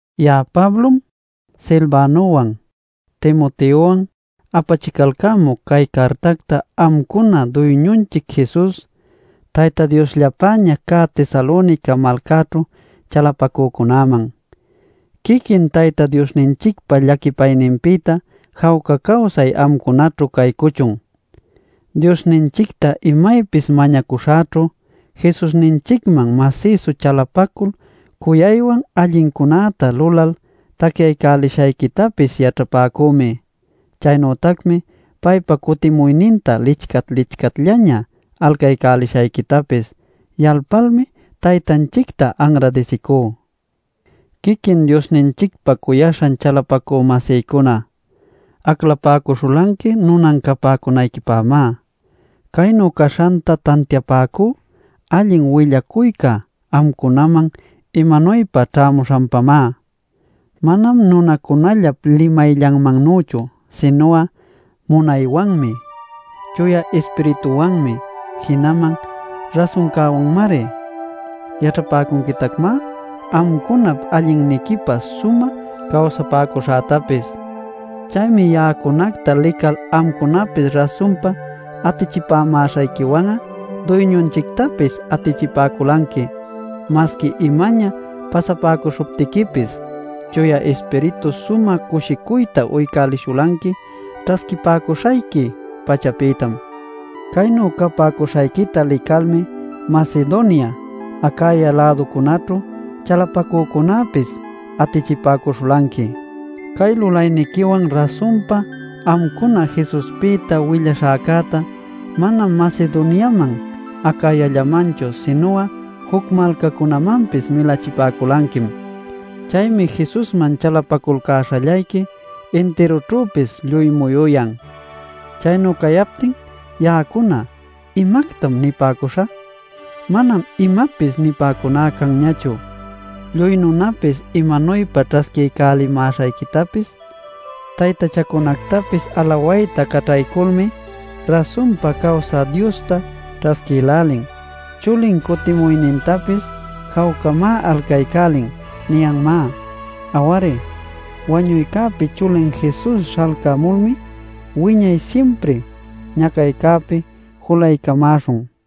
Ya'a Pablom, Silvanowan, Timoteowan apachicalcämuc cay cartacta amcuna Duyñunchic Jesus, Tayta Diosllapäña cä Tesalonica malcäćhu chalapacücunäman. Quiquin Tayta Diosninchicpa llaquipayninpïta jawca cawsay amcunaćhu caycuchun. Diosninchicta imaypis mañacuśhäćhu Jesusninchicman masïsu chalapacul cuyaywan allincunäta lulal tacyaycälishayquitapis yaćhapäcümi. Chaynütacmi paypa cutimuyninta licat-licatllaña alcayalcäśhayquitapis yalpalmi Taytanchicta anradisicú. Quiquin Diosninchicpa cuyaśhan chalapacü-masïcuna, aclapäcuśhulanqui nunan capäcunayquipämá. Caynu caśhanta tantiapäcú allin willacuyca amcunaman imanuypa ćhämuśhanpamá: manam nunacunallap limayllanmannüchu, sinu'a munaywanmi, Chuya Ispirituwanmi, jinaman rasuncäwanmari. Yaćhapäcunquitacmá amcunap allinniquipä sumä cawsapäcuśhätapis. Chaymi ya'acunacta lical amcunapis rasunpa atichipämäśhayquiwan'a Duyñunchictapis atichipäculanqui. Masqui imaña pasapäcuśhuptiquipis, Chuya Ispiritu sumä cushicuyta uycälishulanqui ćhasquipäcuśhayqui-pachapïtam. Caynu capäcuśhayquita licalmi Macedonia, Acaya-läducunaćhu chalapacücunäpis atichipäcuśhulanqui. Cay lulayniquiwan rasunpa amcuna Jesuspïta willaśhäcäta manam Macedoniaman Acayallamanchu sinu'a juc malcacunamanpis milachipäculanquim. Chaymi Jesusman chalapaculcäśhallayqui intirućhüpis lluy muyuyan. Chaynu cayaptin ya'acuna ¿imactam nipäcuśhä? Manam imapis nipäcuná canñachu. Lluy nunapis imanuypa ćhasquiycälimäśhayquitapis: “Taytachancunactapis alawayta caćhayculmi rasunpa cawsä Diosta ćhasquïlälin. Chulin cutimuynintapis jawcamá alcaycälin” niyanmá. Aw-ari, wañuycäpi Chulin Jesus śhalcamulmi wiñay simpri ñacaycäpi julaycamäśhun.